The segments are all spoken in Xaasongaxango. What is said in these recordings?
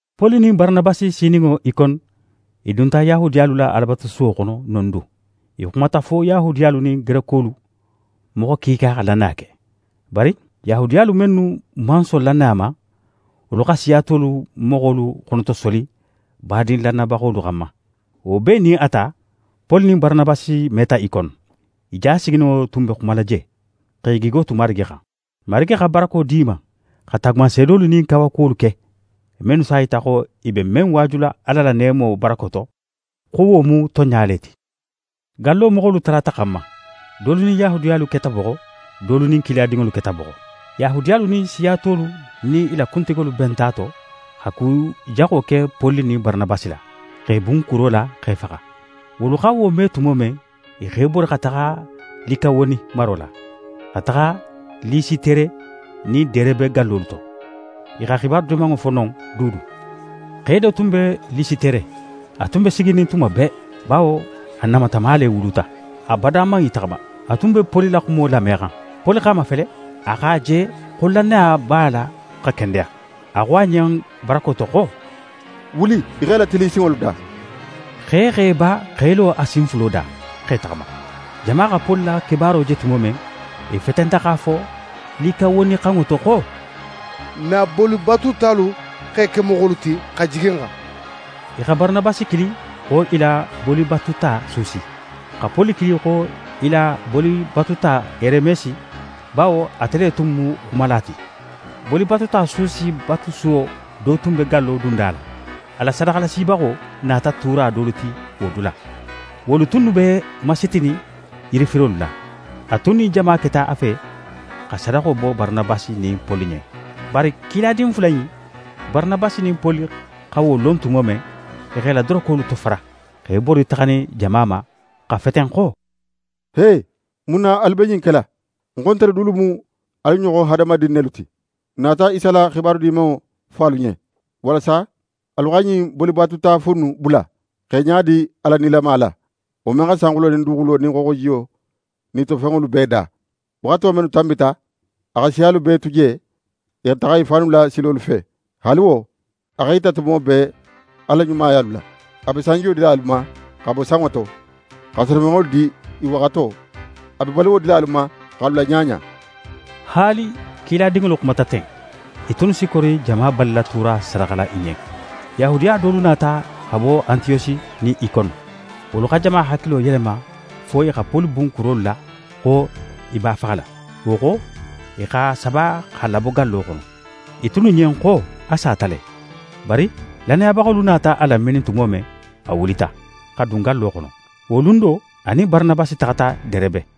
Poli nin Baranabasi sininŋo Ikone, i dunta Yahudiyalu la Alabatusuwo xono non du. I xumata fo Yahudiyalu nin Gerekolu moxo kiika xa lannaya ke. Bari Yahudiyalu mennu man son lannaya ma, wolu xa siya tolu moxolu xonotosoli badin lannayabaxolu xanma. Wo bee nin a ta, Poli nin Baranabasi meta Ikone. I ja sigininŋo tun be xumala je, x'e gigo tu Marigi xan. Marigi xa barako di i ma, xa taagumanseedolu nin kawakuwolu ke, mennu s'a yita xo i be men waajula Ala la neemo barako to, xo wo mu tonɲa le ti. Gallo moxolu talata xan ma. Dolu nin Yahudiyalu keta boxo, dolu nin kiladinŋolu keta boxo. Yahudiyalu nin siya tolu nin i la kuntigolu benta a to, xa ku jaxo ke Poli nin Baranabasi la, x'e bun kuro la x'e faxa. Wolu xa wo me tumo men, i x'e bori xa taxa Likawoni maro la, xa taxa Lisitere nin Derebe gallolu to. I xa xibaru Dimanŋo fo non dulu. Xe do tun be Lisitere, a tun be siginin tuma bee, bawo a namatama le wuluta. A bada man í taxama. A tun be Poli la xumo lamexan. Poli x'a mafele, a x'a je xo lannaya b'a la xa kendeya. A xo a ɲen barako to xo: «Wuli í x'é latilin í sinŋolu da!» Xe x'é ba x'é lo a sin fulo da, x'é taxama. Jama xa Poli la kebaaro je tumo men, i fetenta x'a fo Likawonixanŋo to xo: «N na bolibatutalu x'e ke moxolu ti, xa jigi n xan.» I xa Baranabasi kili xo i la bolibatuta Susi, xa Poli kili xo i la bolibatuta Heremesi, bawo ate le tun mu xumala ti. Bolibatuta Susi batusuwo do tun be gallo dunda la. A la sadaxalasibaxo nata tuura dolu ti wo dula. Wolu tunnu be masitinin yirifirolu la. A tun nin jama keta a fe xa sadaxo bo Baranabasi nin Poli ɲen. Bari kiladin fula in, Baranabasi nin Poli xa wo lon tumo men, i x'e la dorokolu tofara, x'e bori taxanin jama ma, xa feten xo: «He! Mun na alu be ɲin kela? Ń xo, ntelu dulu mu alu ɲoxon hadamadin nelu ti! N nata Isa la xibaru Dimanŋo fo alu ɲen, walasa alu xa ɲin bolibatuta fu innu bula, x'e ɲadi Ala nilama la, wo men xa sanxulo nin duguxulo nin xooxojiyo nin i to fenŋolu bee da. Waxato mennu tanbita, a xa siyalu bee tu je, i xa taxa i fannu la silolu fe. Haali wo, a x'é yita tumo bee a la ɲumayalu la. A be sanjiyo dila alu ma xa bo sanŋo to, xa senefenŋolu di i waxato. A be baluwo dila alu ma, x'alu laɲaɲa.» Haali kiladinŋolu xumata ten, i tunnu si kori jama balila tuura sadaxala i ɲen. Yahudiya dolu nata xa bo Antiyosi nin Ikone. Wolu xa jama hakilo yelema fo i xa Poli bun kurolu la xo i b'a faxala. Wo xo, i x'a saba x'a labo gallo xono. I tunnu ɲen xo a sata le. Bari lannayabaxolu nata a laminin tumo men, a wulita, xa dun gallo xono. Wo lun do, a nin Baranabasi taxata Derebe.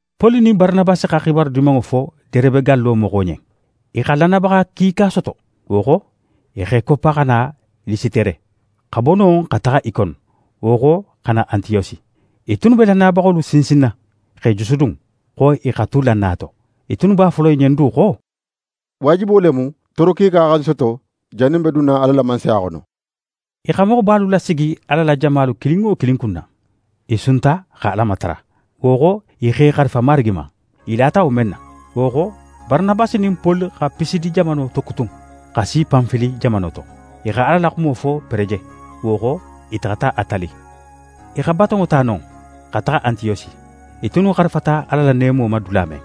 Poli nin Baranabasi xa xibaru Dimanŋo fo Derebe gallo moxo ɲen. I xa lannayabaxa kiika soto. Wo xo, i x'e koppa xa na Lisitere, xa bo non xa taxa Ikone, wo xo xa na Antiyosi. I tunnu be lannayabaxolu sinsinna, x'e jusudun, xo i xa tu lannaya to. I tunnu b'a fola i ɲen du xo: «Waajibo le mu tooro kiika xa n soto jannin n be dunna Ala la Mansaya xono.» I xa moxobalu lasigi Ala la jamalu kilin wo kilin kunna. I sunta, xa Ala matara. Wo xo, i x'e xarifa Marigi ma, i lata wo men na. Wo xo, Baranabasi nin Poli xa Pisidi jamano tokutun, xa si Panfili jamano to. I xa Ala la xumo fo Pereje. Wo xo, i taxata Atali. I xa batonŋo ta non, xa taxa Antiyosi, i tunnu xarifata Ala la neemo ma dula men.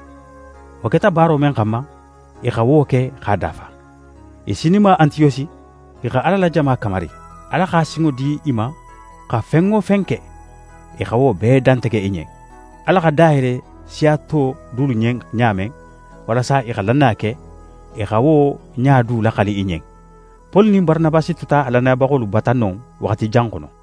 Wo keta baaro men xanma, i xa wo ke x'a dafa. I sininma Antiyosi, i xa Ala la jama kamari. Ala xa sinŋo di i ma xa fen wo fen ke, i xa wo bee dantege i ɲen. Ala xa da yele siya to dulu ɲen ɲa men, walasa i xa lannaya ke, i xa wo ɲa du laxali i ɲen. Poli nin Baranabasi tuta lannayabaxolu bata non waxati jan xono.